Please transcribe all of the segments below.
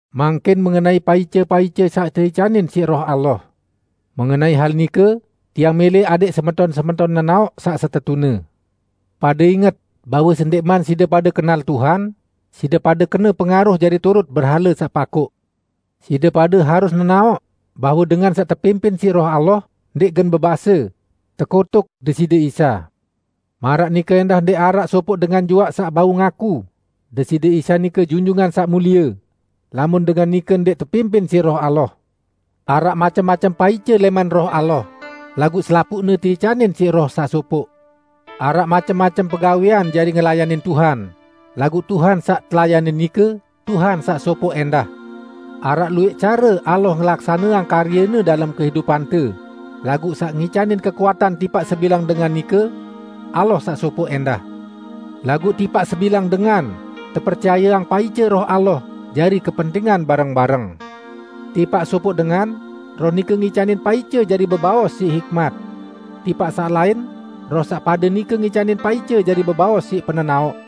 Mangkin mengenai paice-paice saq teicanin siq Roh Allah. Mengenai hal nike, tiang mẽlẽ adẽq semeton-semeton nenaoq saq setetune. Pade inget bahwe sendẽqman side pade kenal Tuhan, side pade kena pengaruh jari turut berhale saq pakoq. Side pade harus nenaoq bahwe dengan saq tepimpin siq Roh Allah ndẽq gen bebase, "Tekutuk Deside Isa!" Maraq nike ẽndah ndẽq araq sopoq dengan juaq saq bau ngaku, "Deside Isa nike Junjungan Saq Mulie!" lamun dengan nike ndẽq tepimpin siq Roh Allah. Araq macem-macem paice lẽman Roh Allah, laguq selapuqne teicanin siq Roh saq sopoq. Araq macem-macem pegawẽan jari ngelayanin Tuhan, laguq Tuhan saq telayanin nike, Tuhan saq sopoq ẽndah! Araq luwẽq care Allah ngelaksaneang karye-Ne dalem kehidupante, laguq saq ngicanin kekuatan tipaq sebilang dengan nike, Allah saq sopoq ẽndah. Laguq tipaq sebilang dengan, tepercayeang paice Roh Allah jari kepentingan bareng-bareng. Tipaq sopoq dengan, Roh nike ngicanin paice jari bebaos siq hikmat. Tipaq saq lain Roh saq pade nike ngicanin paice jari bebaos siq penenaoq.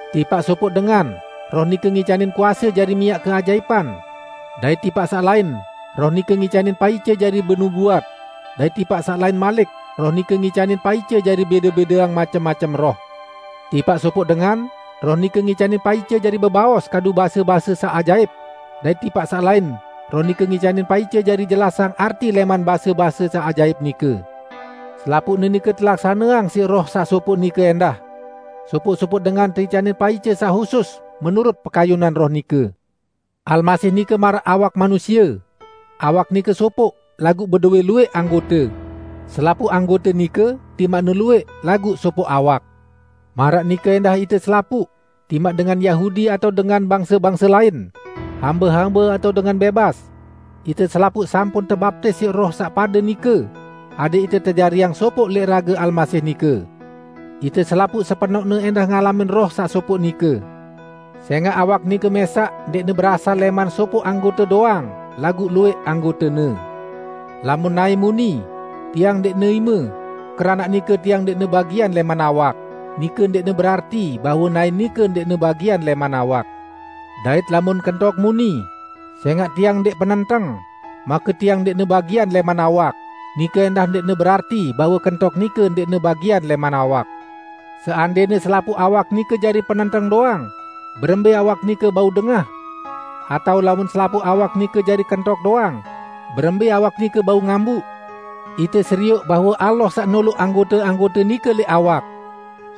Tipaq sopoq dengan Roh nike ngicanin kuase jari miaq keajaipan, dait tipaq saq lain Roh nike ngicanin paice jari benubuat, dait tipaq saq lain malik Roh nike ngicanin paice jari bẽde-bẽdeang macem-macem roh. Tipaq sopoq dengan Roh nike ngicanin paice jari bebaos kadu base-base saq ajaip, dait tipaq saq lain Roh nike ngicanin paice jari jelasang arti lẽman base-base saq ajaip nike. Selapuqne nike telaksaneang siq Roh saq sopoq nike ẽndah; sopoq-sopoq dengan teicanin paice saq husus menurut pekayunan Roh nike. Almasih nike maraq awak manusie; awak nike sopoq, laguq bedowẽ luwẽq anggote. Selapuq anggote nike, timaqne luwẽq, laguq sopoq awak. Maraq nike ẽndah ite selapuq, timaq dengan Yahudi atao dengan bangse-bangse lain, hambe-hambe atao dengan bẽbas; ite selapuq sampun tebaptis siq Roh saq pade nike, adẽq ite tejariang sopoq lẽq rage Almasih nike. Ite selapuq sepenoqne ẽndah ngalamin Roh saq sopoq nike. Sẽngaq awak nike mẽsaq ndẽqne berasal lẽman sopoq anggote doang laguq luwẽq anggotene. Lamun naẽ muni, "Tiang ndẽqne ime, keranaq nike tiang ndẽqne bagian lẽman awak," nike ndẽqne berarti bahwe naẽ nike ndẽqne bagian lẽman awak. Dait lamun kentok muni, "Sẽngaq tiang ndẽq penenteng, make tiang ndẽqne bagian lẽman awak," nike ẽndah ndẽqne berarti bahwe kentok nike ndẽqne bagian lẽman awak. Seandẽne selapuq awak nike jari penenteng doang, berembẽ awak nike bau dengah? Atao lamun selapuq awak nike jari kentok doang, berembẽ awak nike bau ngambuq? Ite serioq bahwe Allah saq noloq anggote-anggote nike lẽq awak.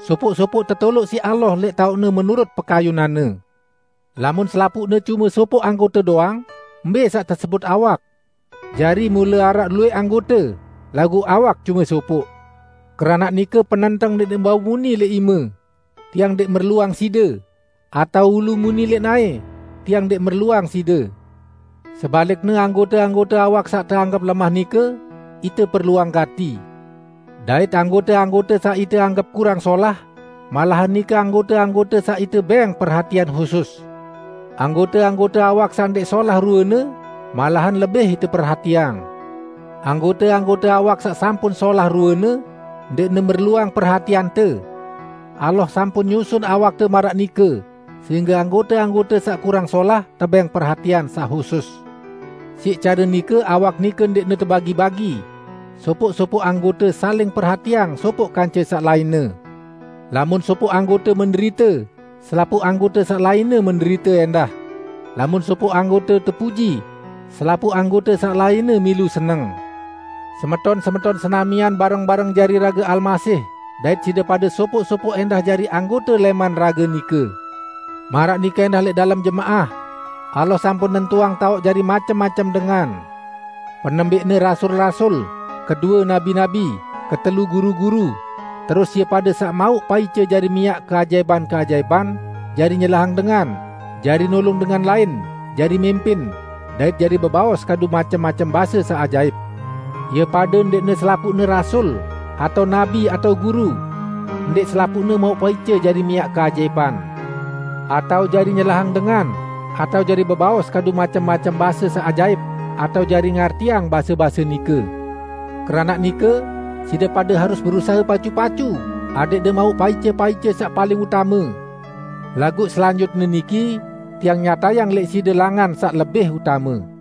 Sopoq-sopoq tetoloq siq Allah lẽq taoqne menurut pekayunan-Ne. Lamun selapuqne cume sopoq anggote doang, mbẽ saq tesebut awak? Jari mule araq luwẽq anggote, laguq awak cume sopoq. Keranaq nike, penenteng ndẽqne bau muni lẽq ime, "Tiang ndẽq merluang side!" atao ulu muni lẽq naẽ, "Tiang ndẽq merluang side!" Sebalikne anggote-anggote awak saq teanggep lemah nike, ite perluang gati; dait anggote-anggote saq ite anggep kurang solah, malahan nike anggote-anggote saq ite bẽng perhatian husus. Anggote-anggote awak saq ndẽq solah ruene, malahan lebih ite perhatiang. Anggote-anggote awak saq sampun solah ruene, ndẽqne merluang perhatiante. Allah sampun nyusun awakte maraq nike sehingge anggote-anggote saq kurang solah tebẽng perhatian saq husus. Siq care nike awak nike ndẽqne tebagi-bagi; sopoq-sopoq anggote saling perhatiang sopoq kance saq lainne. Lamun sopoq anggote menderite, selapuq anggote saq lainne menderite ẽndah; lamun sopoq anggote tepuji, selapuq anggote saq lainne milu seneng. Semeton-semeton senamian bareng-bareng jari rage Almasih dait side pade sopoq-sopoq ẽndah jari anggote lẽman rage nike. Maraq nike ẽndah lẽq dalem jemaah, Allah sampun nentuang taoq jari macem-macem dengan: Penembẽqne rasul-rasul; kedue nabi-nabi, ketelu guru-guru, terus ie pade saq mauq paice jari miaq keajaipan-keajaipan, jari nyelahang dengan, jari nulung dengan lain, jari mimpin, dait jari bebaos kadu macem-macem base saq ajaip. Ie pade ndẽqne selapuqne rasul, atao nabi, atao guru. Ndẽq selapuqne mauq paice jari miaq keajaipan, atao jari nyelahang dengan, atao jari bebaos kadu macem-macem base saq ajaip, atao jari ngartiang base-base nike. Keranaq nike, side pade harus berusahe pacu-pacu adẽqde mauq paice-paice saq paling utame. Laguq selanjutne niki tiang nyatayang lẽq side langan saq lebih utame.